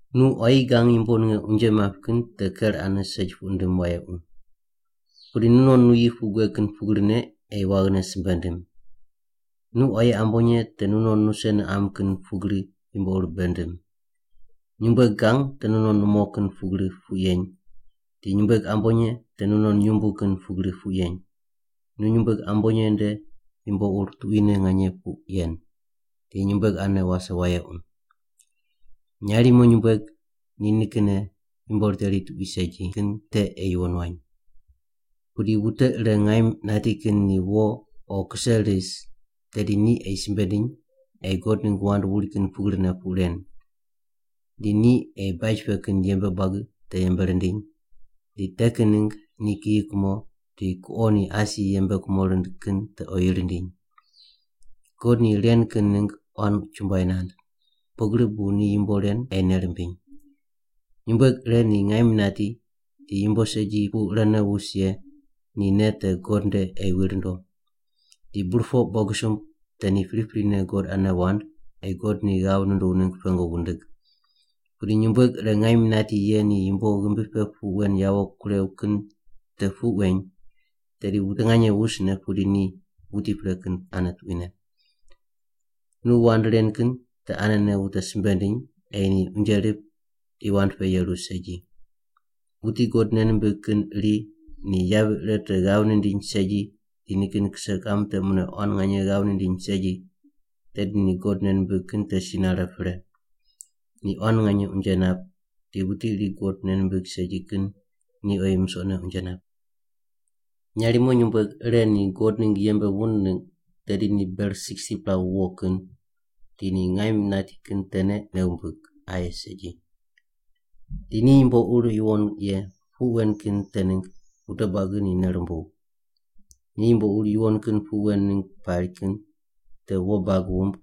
Nu quayi gang yumbo ninge unje map kin te ker ane segi puq ndim wayequ. Pudi nunon nuyi puq gueg kin pugrine ei waghine simbe ndim. Nu quayi ambonye te nunon nuse niqam kin pugri yumbo ur bei ndim. Nyumbueg gang te nunon numo kin pugri puq yeny, di nyumbueg ambonye te nunon nyumbu kin pugri puq yeny, nu nyumbueg ambonye nde yumbo ur tuquine nganye puq yen, di nyumbueg ane wase wayequ. Nyarimo nyumbueg ni nikinne yumbo riteri tuqui segi kin te ei yuwon wany. Pudi wute ire ngaim nati kin ni wo o kuqo ris, tedi ni ei simbe ndiny ei God ningg wand wuri kin pugrine puq ren. Di ni ei baj pe kin yembe buagi te yembe rindiny, di te kin ningg ni kiyi kumo di kuqo ni asi yembe kumo rind kin te oyi rindiny. God ni ren kin ningg quan chumbuai nand, pugri bu ni yumbo ren ei nei rimbiny. Nyumbueg ire ni ngaim nati di yumbo segi pu irene wus ye ni nei te God nde ei wi rundo. Di burpoq bogisumb te ni priprine God ane wand ei God ni ghav nunduw ningg pengu wundig. Pudi nyumbueg ire ngaim nati ye ni yumbo ghimbi pe puq wen yawo kurew kin te puq weny, tedi wute nganye wusne pudi ni wuti pre kin ane tuquine. Nu wand ren kin te anene wute simbe ndiny ei ni unje rip di wand pe yeru segi. Wuti God nei nimbig kin iri ni yavi ire te ghav nindiny segi di nikin kise kiqam te mune quan nganye ghav nindiny segi, tedi ni God nei nimbig kin te si nare pre. Ni quan nganye unje nap di wuti iri God nei nimbig segi kin ni oyi musoqne unje nap. Nyarimo nyumbueg ire ni God ningg yembe wund ningg tedi ni ber 60-pela wuwo kin, di ni ngaim nati kin tene nei wumbig, aye segi. Di ni yumbo ur yuwon ye puq wen kin te ningg wute buagi ni nei rumbuw. Ni yumbo ur yuwon kin puq wen ningg pari kin te wo bag wumb,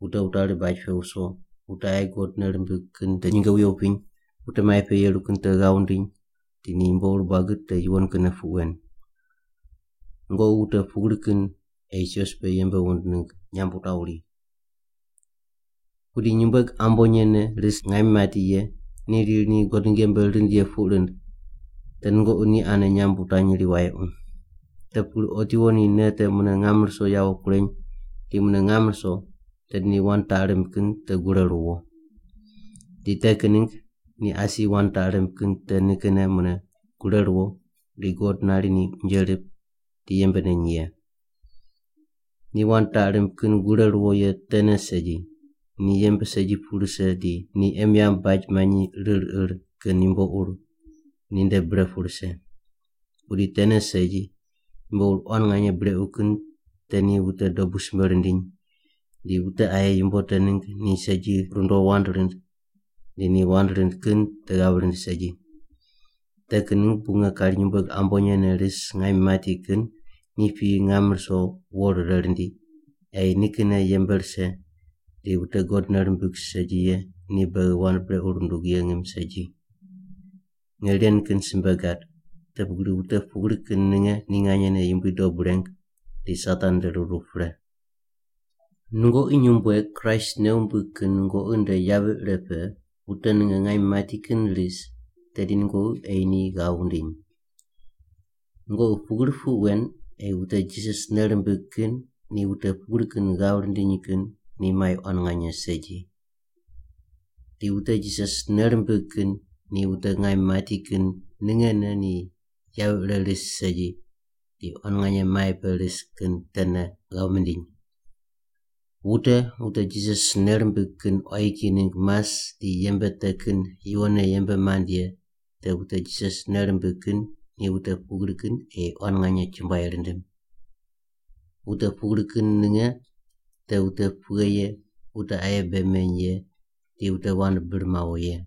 wute wutari baj pe wuso, wute aye God nei rimbig kin te nyinge wuye wupiny, wute mai pe yeru kin te ghav wundiny di ni yumbo ur buagi te yuwon kinne puq wen. Nungoqi wute pugri kin ei sios pe yembe wund ningg nyamb wutaw ri. Pudi nyumbueg ambonye ne ris ngaim mati ye ni riri ni God ningg yembe rind ye puq rind, te nungoqi ni ane nyamb wutanyri wayequ. Te pugri otiwo ni nei te mune ngam ruso yawo kureny di mune ngam ruso, tedi ni wand taq rimb kin te gure ruwo. Di te kin ningg ni asi wand taq rimb kin te nikinne mune gure ruwo di God nari ni unje rip di yembe neny ye. Ni wand taq rimb kin gure ruwo ye tene segi, ni yembe segi pu rise di ni em yamb baj manyi rir ir kin yumbo ur ninde bre pu rise. Pudi tene segi, yumbo ur quan nganye brequ kin te ni wute dobu simbe rindiny, di wute aye yumbo te ningg ni segi rundo wand rind di ni wand rind kin te ghav rind segi. Te kin ningg bu nge kari nyumbueg ambonye ne ris ngaim mati kin ni piyi ngam ruso wo rire rindi, ei nikinne yembe rise di wute God nei rimbig segi ye ni beghi wand brequ rundug ye ngim segi. Nge ren kin simbe gad, te pugri wute pugri kin ninge ni nganyene Yumbui dob reng di Satan nde ruru pre. Nungoqi nyumbueg Kraist nei wumbig kin nungoqi nde yavi ire pe wute ninge ngaim mati kin ris, tedi nungoqi ei ni ghav wundiny. Nungoqi pugri puq wen ei wute Jisas nei rimbig kin ni wute pugri kin ghav rindiny kin ni mai quan nganye segi. Di wute Jisas nei rimbig kin ni wute ngaim mati kin ningene ni yavi ire ris segi di quan nganye mai pe ris kin tene ghav mindiny. Wute wute Jisas nei rimbig kin quayi kiyi ningg mas di yembe te kin yuwonne yembe mand ye te wute Jisas nei rimbig kin ni wute pugri kin ei quan nganye chumbuai rindim. Wute pugri kin ninge te wute pughe ye wute aye bei meny ye di wute wand bir mawo ye.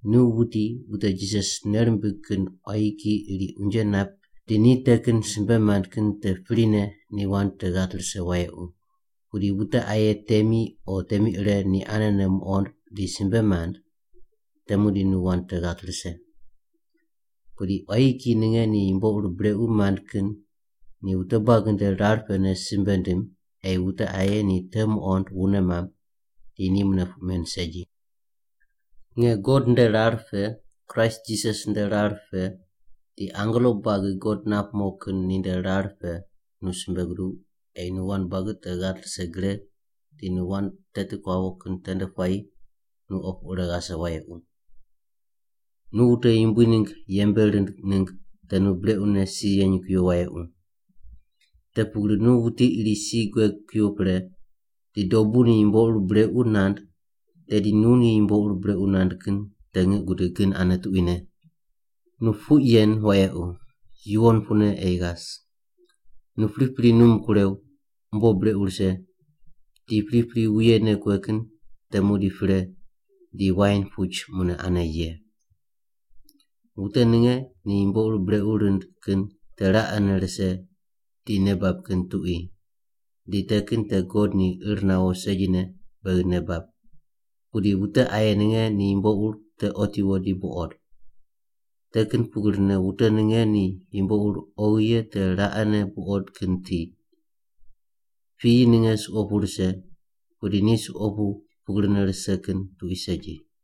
Nu wuti wute Jisas nei rimbig kin quayi kiyi iri unje nap di ni te kin simbe mand kin te prine ni wand te ghat rise wayequ, pudi wute aye temi o temi ire ni anene muqond di simbe mand, te muqdi nu wand te ghat rise. Pudi quayi kiyi ninge ni yumbo ur brequ mand kin ni wute buagi nde rar pene simbe wundim ei wute aye ni te muqond wune mamb, di ni mune puq men segi. Nge God nde rar pe, Kraist Jisas nde rar pe, di angelo buagi God nap mo kin ni nde rar pe nu simbe guduw ei nu wand buagi te ghat rise gre di nu wand teti kuawo kin tende puayi nu opu ire ghase wayequ. Nu wute Yumbui ningg yembe rind ningg te nu brequne si yeny kuyo wayequ. Te pugri nu wuti iri si gueg kuyo pre, di dobu ni yumbo ur brequ nand tedi nu ni yumbo ur brequ nand kin te ngiq gudig kin ane tuquine. Nu puq yen wayequ, yuwon pune ei ghas. Nu pripri num kurew, umbo brequ rise, di pripri wuyene kue kin te muqdi pre di wain puch mune ane ye. Wute ninge ni yumbo ur brequ rind kin te raqene rise di nei bab kin tuqui. Di te kin te God ni ir nawo segine beghi nei bab. Pudi wute aye ninge ni yumbo ur te otiwo di buqod. Te kin pugrine wute ninge ni yumbo ur oghi ye te raqene buqod kin tiq. Piyi ninge suqo pu rise, pudi ni suqo pu pugrine rise kin tuqui segi.